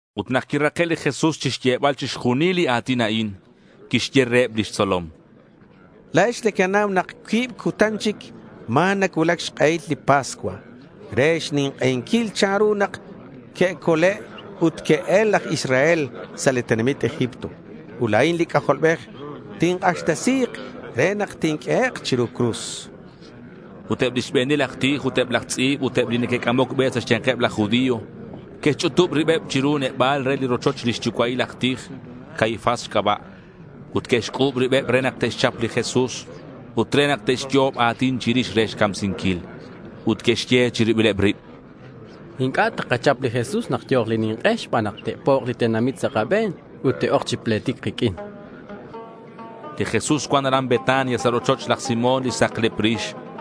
Ut nak quirake' li Jesús chixyebal chixjunil li a̱tin a'in, quixye reheb lix tzolom: —La̱ex nequenau nak cuib cutan chic ma̱ nacuulac xk'ehil li pascua re xnink'einquil chanru nak que'cole' ut que'el laj Israel sa' li tenamit Egipto. Ut la̱in li C'ajolbej tink'axtesi̱k re nak tinq'uehek' chiru cruz. Ut eb lix be̱nil aj tij ut eb laj tz'i̱b ut eb li neque'c'amoc be sa' xya̱nkeb laj judío que'xch'utub ribeb chiru neba̱l re li rochoch lix yucua'ileb laj tij, Caifás xc'aba'. Ut que'xc'u̱b ribeb re nak te'xchap li Jesús ut re nak te'xyo'ob a̱tin chirix re xcamsinquil. Ut que'xye chiribileb rib: —Inc'a' takachap li Jesús nak yo̱k li nink'e xban nak te'pok' li tenamit sa' kabe̱n ut te'oc chi pletic kiq'uin, chanqueb. Li Jesús cuan aran Betania sa' rochoch laj Simón li saklep rix.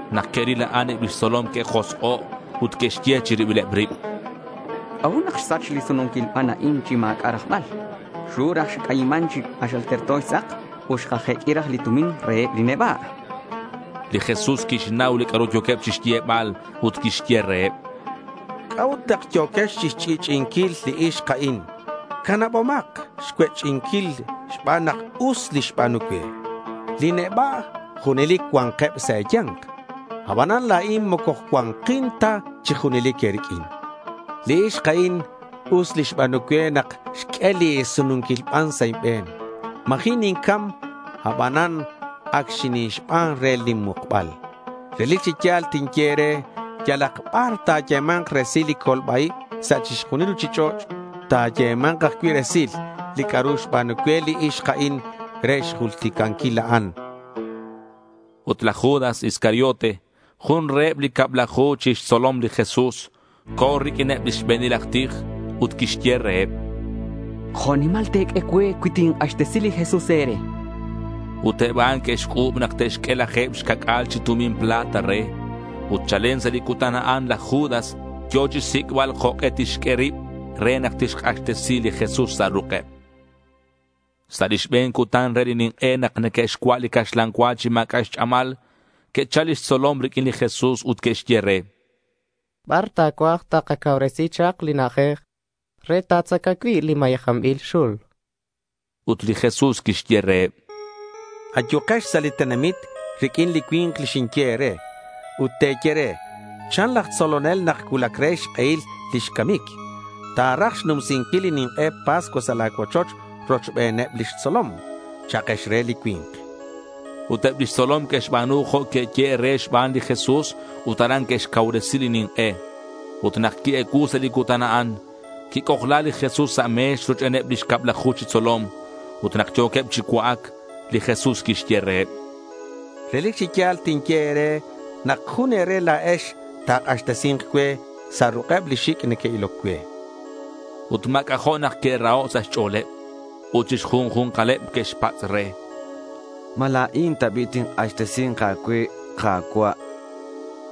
Nak que'ril a'an, eb lix tzolom que'josk'o' ut que'xye chi ribileb rib: —¿C'a'ut nak xsach li sununquil ban a'in chi ma̱c'a' rajbal? Xru raj xc'ayiman chi k'axal terto xtz'ak ut xkajeq'ui raj li tumin reheb li neba', chanqueb. Li Jesús quixnau li c'a'ru yo̱queb chixyebal ut quixye reheb: —¿C'a'ut nak yo̱quex chixch'i'ch'i'inquil li ixk a'in? Canabomak xcuech'inquil xban nak us li xba̱nu cue. Li neba' junelic cua̱nkeb sa' e̱ya̱nk. Abanan la̱in moco cua̱nkin ta chi junelic e̱riq'uin. Li ixk a'in us li xba̱nu cue nak xq'ue li sununquil ban sa' inbe̱n. Ma̱ji' nincam abanan ac xinixban re lin mukbal. Relic chi ya̱l tinye e̱re yalak bar ta̱yema̱nk resil li colba-ib sa' chixjunil li ruchich'och', ta̱yema̱nk ajcui' resil li c'a'ru xba̱nu cue li ixk a'in re xjulticanquil a'an, chan. Ut laj Judas Iscariote, jun reheb li cablaju chi xtzolom li Jesús, co̱ riq'uineb lix be̱nil aj tij. Ut quixye reheb: —¿Jo' nimal te̱q'ue cue cui tink'axtesi li Jesús e̱re? chan reheb. Ut eb a'an que'xc'u̱b nak te'xq'ue laje̱b xca'c'a̱l chi tumin plata re. Ut chalen sa' li cutan a'an, laj Judas yo̱ chixsic'bal jok'e tixq'ue rib re nak tixk'axtesi li Jesús sa' ruk'eb. Sa' li xbe̱n cutan re li nink'e nak neque'xcua' li caxlan cua chi ma̱c'a' xch'amal, que'chal lix tzolom riq'uin li Jesús ut que'xye re: —¿Bar ta̱cuaj takacauresi chak li na'ajej re ta̱tzaca cui' li mayejanbil xul? chanqueb. Ut li Jesús quixye reheb: —Ayukex sa' li tenamit riq'uin li cui̱nk li xinye e̱re, ut te̱ye re, “Chan laj tzolonel nak cuulac re xk'ehil lix camic. Ta̱raj xnumsinquil li nink'e Pascua sa' la̱ cuochoch rochbeneb lix tzolom,” cha'kex re li cui̱nk. Ut eb lix tzolom que'xba̱nu jo' que'yehe' reheb xban li Jesús ut aran que'xcauresi li nink'e. Ut nak qui-ecuu sa' li cutan a'an, quic'ojla li Jesús sa' me̱x rochbeneb lix cablaju chi tzolom. Ut nak yo̱queb chi cua'ac, li Jesús quixye reheb: —Relic chi ya̱l tinye e̱re nak jun e̱re la̱ex ta̱k'axtesi̱nk cue sa' ruk'eb li xic' neque'iloc cue, chan. Ut ma̱c'a' jo' nak que'raho' sa' xch'o̱leb. Ut chi xjunju̱nkaleb que'xpatz' re: —¿Ma la̱in ta bi' tink'axtesi̱nk a̱cue, Ka̱cua'?—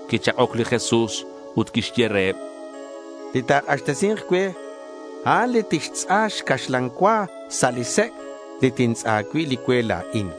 Quichak'oc li Jesús ut quixye reheb: —Li ta̱k'axtesi̱nk cue, a'an li tixtz'a xcaxlan cua sa' li sec' li tintz'a cui' li cue la̱in.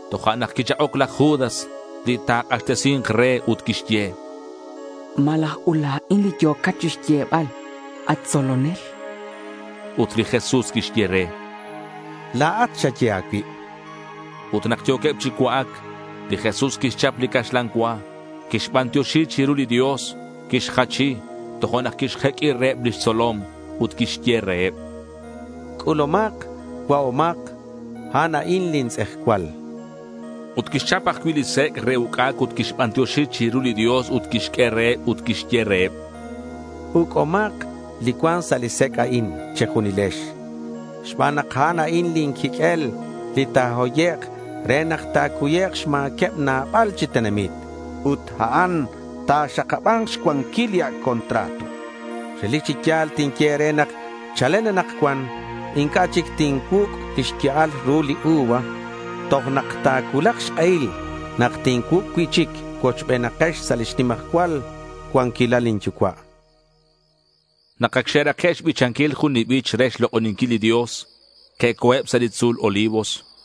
Tojo'nak quichak'oc laj Judas li ta̱k'axtesi̱nk re ut quixye: —¿Malaj ut la̱in li yo̱cat chinyebal, at tzolonel? Ut li Jesús quixye re: —La̱at xaye a̱cuib. Ut nak yo̱queb chi cua'ac, li Jesús quixchap li caxlan cua. Quixbantioxi chiru li Dios, quixjachi, tojo'nak quixjeq'ui reheb lix tzolom. Ut quixye reheb: —C'ulumak, cua'omak. A'an a'in lin tz'ejcual.— Ut quixchap ajcui' li sec' re uc'ac ut quixbantioxi chiru li Dios ut quixq'ue reheb ut quixye reheb: —Uc'umak li cuan sa' li sec' a'in che̱junilex, xban nak a'an a'in lin quiq'uel li ta̱hoyek' re nak ta̱cuyek' xma̱queb nabal chi tenamit. Ut a'an ta̱xakaba̱nk xcuanquil li Ac' Contrato. Relic chi ya̱l tinye e̱re nak chalen anakcuan inc'a' chic tincuuc' lix ya'al ru li uva toj nak ta̱cuulak xk'ehil nak tincuuc' cui'chic cuochbenex sa' lix nimajcual cuanquilal lin Yucua', chan li Jesús. Nak ac xe'rake' xbichanquil jun li bich re xlok'oninquil li Dios, que'co̱eb sa' li tzu̱l Olivos.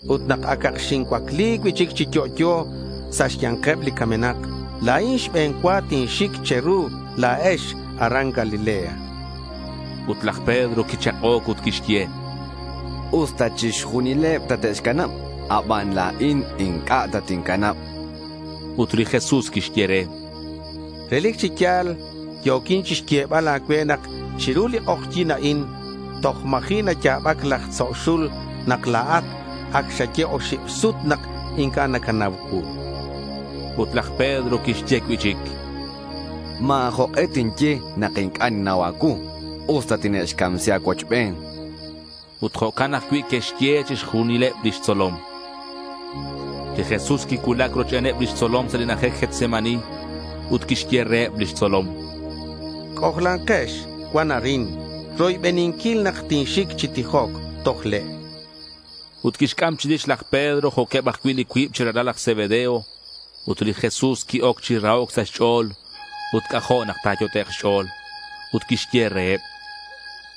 Ut nak acak xincuacli cui'chic chi yo'yo sa' xya̱nkeb li camenak la̱in xbe̱n cua tinxic che̱ru la̱ex aran Galilea, chan li Jesús. Ut laj Pedro quichak'oc ut quixye: —Usta chixjunileb tate'xcanab, abanan la̱in inc'a' tatincanab, chan. Ut li Jesús quixye re: —Relic chi ya̱l yo̱quin chixyebal a̱cue nak chiru li k'ojyi̱n a'in toj ma̱ji' naya̱bac laj tzo' xul nak la̱at ac xaye oxib sut nak inc'a' nacanau cuu.— Ut laj Pedro quixye cui'chic: —Ma̱ jok'e tinye nak inc'a' ninnau a̱cuu, usta tine'xcamsi a̱cuochben, chan. Ut jo'can ajcui' que'xye chixjunileb lix tzolom. Li Jesús quicuulac rochbeneb lix tzolom sa' li na'ajej Getsemaní. Ut quixye reheb lix tzolom: —C'ojlankex cuan arin roybeninquil nak tinxic chi tijoc toj le', chan. Ut quixc'am chirix laj Pedro jo'queb ajcui' li cuib chi ralal laj Zebedeo. Ut li Jesús qui-oc chi rahoc sa' xch'o̱l ut c'ajo' nak ta̱yot'ek' xch'o̱l. Ut quixye reheb: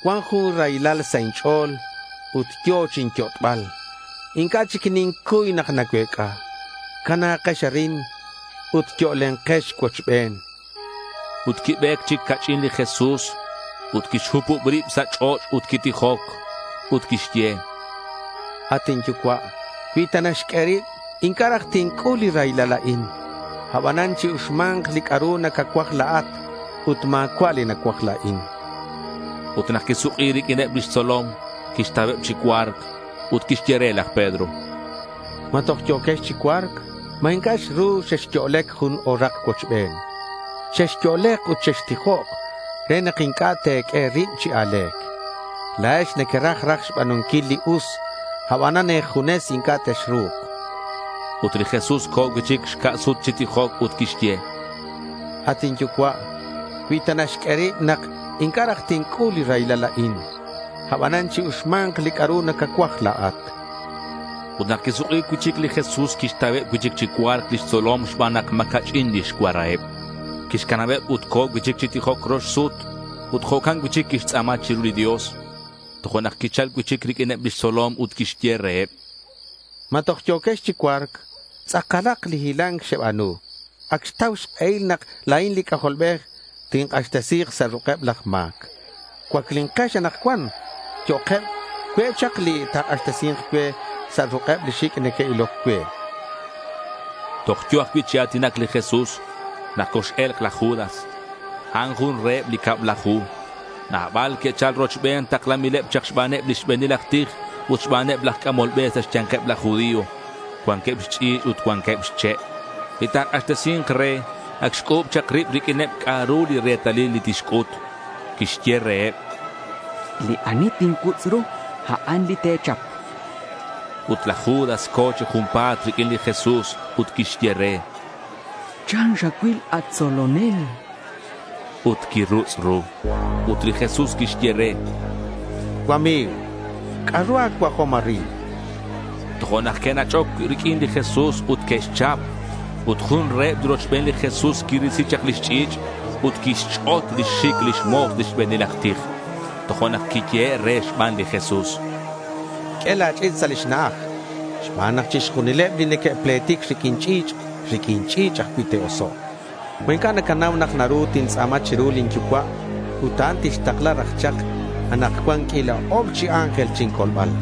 —Cuan jun raylal sa' inch'o̱l ut yo̱ chinyot'bal. Inc'a' chic nincuy nak nacuec'a. Cana̱kex arin ut yo'lenkex cuochben, chan. Ut quibe̱c chic ca'ch'in li Jesús ut quixhupub rib sa' ch'och' ut quitijoc. Ut quixye: —At inYucua', cui ta naxq'ue rib, inc'a' raj tinc'ul li raylal a'in. Abanan chi-uxma̱nk li c'a'ru nacacuaj la̱at ut ma̱cua' li nacuaj la̱in.— Ut nak quisuk'i riq'uineb lix tzolom, quixtauheb chi cua̱rc. Ut quixye re laj Pedro: —¿Ma toj yo̱quex chi cua̱rc? ¿Ma inc'a' xru xexyo'lec jun o̱rak cuochben? Chexyo'lek ut chextijok re nak inc'a' te̱q'ue e̱rib chi a̱le̱c. La̱ex nequeraj raj xba̱nunquil li us, abanan e̱junes inc'a' texru̱k, chan. Ut li Jesús co̱ cui'chic xca' sut chi tijoc ut quixye: —At inYucua', cui ta naxq'ue rib nak inc'a' raj tinc'ul li raylal a'in, abanan chi-uxma̱nk li c'a'ru nacacuaj la̱at.— Ut nak quisuk'i cui'chic li Jesús, quixtauheb cui'chic chi cua̱rc lix tzolom xban nak ma̱ ca'ch'in lix cuaraheb. Quixcanabeb ut co̱ cui'chic chi tijoc rox sut ut jo'can cui'chic quixtz'a̱ma chiru li Dios. Tojo'nak quichal cui'chic riq'uineb lix tzolom ut quixye reheb: —¿Ma toj yo̱quex chi cua̱rc? Tz'akalak li hila̱nc xeba̱nu. Ac xtau xk'ehil nak la̱in li C'ajolbej tink'axtesi̱k sa' ruk'eb laj ma̱c. Cuaclinkex anakcuan, yo'keb; cue' chak li ta̱k'axtesi̱nk cue sa' ruk'eb li xic' neque'iloc cue, chan. Toj yo̱ ajcui' chi a̱tinac li Jesús nak cox-e̱lk laj Judas. A'an jun reheb li cablaju. Nabal que'chal rochben taklanbileb chak xbaneb li xbe̱nil aj tij ut xbaneb laj c'amol be sa' xya̱nkeb laj judío. Cuanqueb xch'i̱ch' ut cuanqueb xche'. Li ta̱k'axtesi̱nk re ac xc'u̱b chak rib riq'uineb c'a'ru li retalil li tixc'ut. Quixye reheb: —Li ani tincuutz' ru, a'an li te̱chap.— Ut laj Judas co̱ chi junpa̱t riq'uin li Jesús ut quixye re: —¿Chan xacuil, at tzolonel?— ut quirutz' ru. Ut li Jesús quixye re: —Cuami̱g, ¿c'a'ru a̱cuajom arin?— Tojo'nak que'nach'oc riq'uin li Jesús ut que'xchap. Ut jun reheb li rochben li Jesús quirisi chak lix ch'i̱ch' ut quixch'ot lix xic lix mo̱s li xbe̱nil aj tij. Tojo'nak quiyehe' re xban li Jesús: —Q'ue la̱ ch'i̱ch' sa' lix na'aj xban nak chixjunileb li neque'pletic riq'uin ch'i̱ch', riq'uin ch'i̱ch' ajcui' te'osok'. ¿Ma inc'a' nacanau nak naru tintz'a̱ma chiru lin Yucua' ut a'an tixtakla raj chak anakcuan anakcuan q'uila ok'ob chi ángel chincolbal?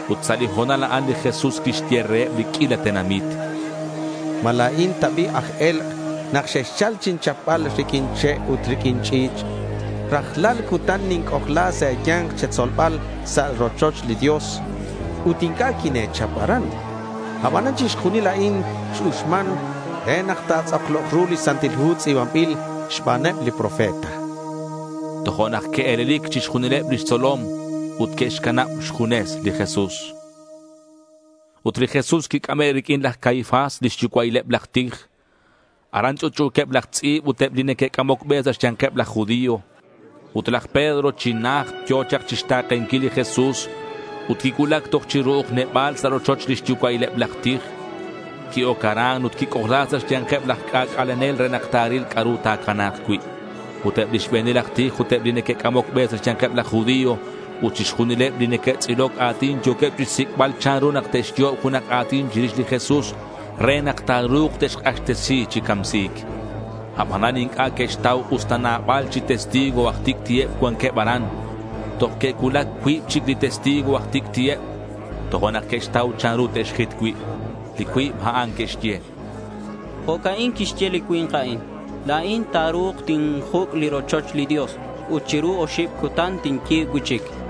Ut sa' li ho̱nal a'an li Jesús quixye reheb li q'uila tenamit, —¿Ma la̱in ta bi' aj e̱lk' nak xexchal chinchapbal riq'uin che' ut riq'uin ch'i̱ch'? Rajlal cutan ninc'ojla sa' e̱ya̱nk che̱tzolbal sa' li rochoch li Dios ut inc'a' quine̱chap aran. Abanan chixjunil a'in x-uxman re nak ta̱tz'aklok ru li Santil Hu tz'i̱banbil xbaneb li profeta. Tojo'nak que'e̱lelic chixjunileb lix tzolom ut que'xcanab xjunes li Jesús. Ut li Jesús quic'ame' riq'uin laj Caifás, lix yucua'ileb laj tij. Aran ch'utch'u̱queb laj tz'i̱b ut eb li neque'c'amoc be sa' xya̱nkeb laj judío. Ut laj Pedro chi najt yo̱ chak chixta̱kenquil li Jesús ut quicuulac toj chi ru'uj neba̱l sa' rochoch lix yucua'ileb laj tij. Qui-oc aran ut quic'ojla sa' xya̱nkeb laj c'ac'alenel re nak ta̱ril c'a'ru ta̱cana̱k cui'. Ut eb li xbe̱nil aj tij ut eb li neque'c'amoc be sa' xya̱nkeb laj judío ut chixjunileb li neque'tz'iloc a̱tin yo̱queb chixsic'bal chanru nak te'xyo'ob junak a̱tin chirix li Jesús re nak ta̱ru̱k te'xk'axtesi chi camsi̱c. Abanan inc'a' que'xtau usta nabal chi testigo aj tic'ti'eb cuanqueb aran. Toj que'cuulac cuib chic li testigo aj tic'ti'eb, tojo'nak que'xtau chanru te'xjit cui'. Li cuib a'an que'xye: —Jo'ca'in quixye li cui̱nk a'in, “La̱in ta̱ru̱k tinjuc' li rochoch li Dios ut chiru oxib cutan tinyi̱b cui'chic”, chan.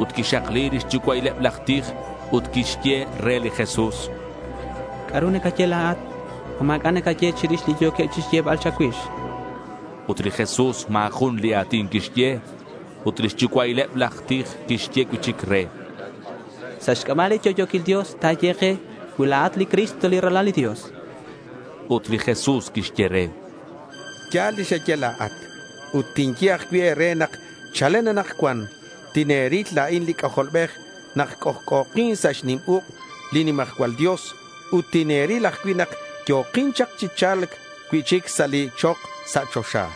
Ut quixakli lix yucua'ileb laj tij ut quixye re li Jesús: —¿C'a'ru nacaye la̱at? ¿Ma ma̱c'a' nacaye chirix li yo̱queb chixyebal cha̱cuix?— Ut li Jesús ma̱ jun li a̱tin quixye. Ut li xyucua'ileb aj tij quixye cui'chic re: —Sa' xc'aba' li yo'yo̱quil Dios ta̱ye ke cui la̱at li Cristo, li Ralal li Dios.— Ut li Jesús quixye re: —Ya̱l li xaye la̱at. Ut tinye ajcui' e̱re nak chalen anakcuan tine̱ril la̱in li C'ajolbej nak c'ojc'o̱kin sa' xnim uk' li nimajcual Dios ut tine̱ril ajcui' nak yo̱kin chak chi cha̱lc cui'chic sa' li chok sa' choxa, chan.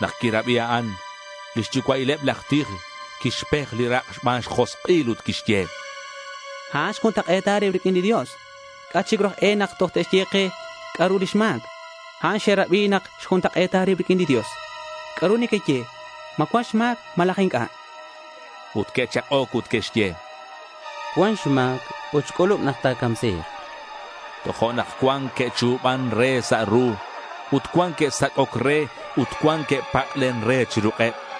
Nak quirabi a'an, li xyucua'ileb laj tij quixpej li rak' xban xjosk'il ut quixye: —A'an xjuntak'e̱ta rib riq'uin li Dios. ¿C'a' chic ru aj e nak toj te'xye ke c'a'ru lix ma̱c? Ac xerabi nak xjuntak'e̱ta rib riq'uin li Dios. ¿C'a'ru nequeye? ¿Ma cuan xma̱c malaj inc'a'? chan. Ut que'chak'oc ut que'xye: —Cuan xma̱c ut xc'ulub nak ta̱camsi̱k.— Tojo'nak cuan que'chu̱ban re sa' ru. Ut cuan que'sac'oc re ut cuan que'pak'len re chi ruk'eb.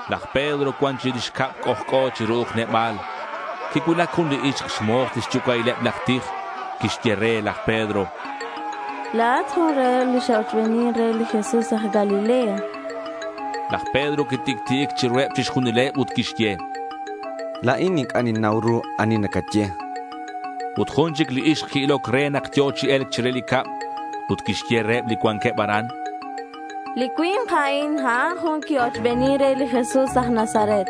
Laj Pedro cuan chirix cab c'ojc'o chi ru'uj neba̱l. Quicuulac jun li ixk, xmo̱s li xyucua'ileb laj tij. Quixye re laj Pedro: —La̱at jun reheb li xe'ochbenin re li Jesús aj Galilea.— Laj Pedro quitic'ti'ic chiruheb chixjunileb ut quixye: —La̱in inc'a' ninnau ru ani nacaye, chan. Ut jun chic li ixk qui-iloc re nak yo̱ chi e̱lc chire li cab. Ut quixye reheb li cuanqueb aran: —Li cui̱nk a'in, a'an jun qui-ochbenin re li Jesús aj Nazaret.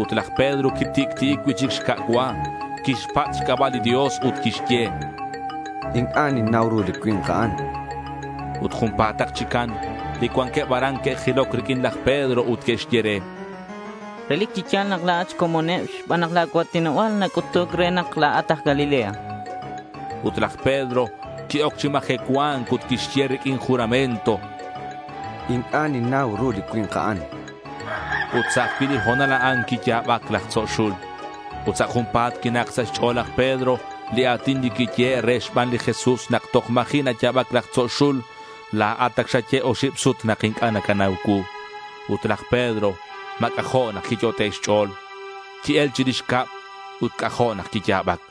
Ut laj Pedro quitic'ti'ic cui'chic xca' cua. Quixpatz' xc'aba' li Dios ut quixye: —Inc'a' ninnau ru li cui̱nk a'an, chan. Ut junpa̱tak chican, li cuanqueb aran que'jiloc riq'uin laj Pedro ut que'xye re: —Relic chi ya̱l nak la̱at xcomoneb xban nak la̱ cua̱tinoba̱l nac'utuc re nak la̱at aj Galilea.— Ut laj Pedro qui-oc chi majecua̱nc ut quixye riq'uin juramento: —Inc'a' ninnau ru li cui̱nk a'an, chan. Ut sa' ajcui' li ho̱nal a'an quiya̱bac laj tzo' xul. Ut sa' junpa̱t quinak sa' xch'o̱l laj Pedro li a̱tin li quiyehe' re xban li Jesús, “Nak toj ma̱ji' naya̱bac laj tzo' xul, la̱at ac xaye oxib sut nak inc'a' nacanau cuu.” Ut laj Pedro ma̱ c'ajo' nak quiyot'e' xch'o̱l. Qui-el chirix cab ut c'ajo' nak quiya̱bac.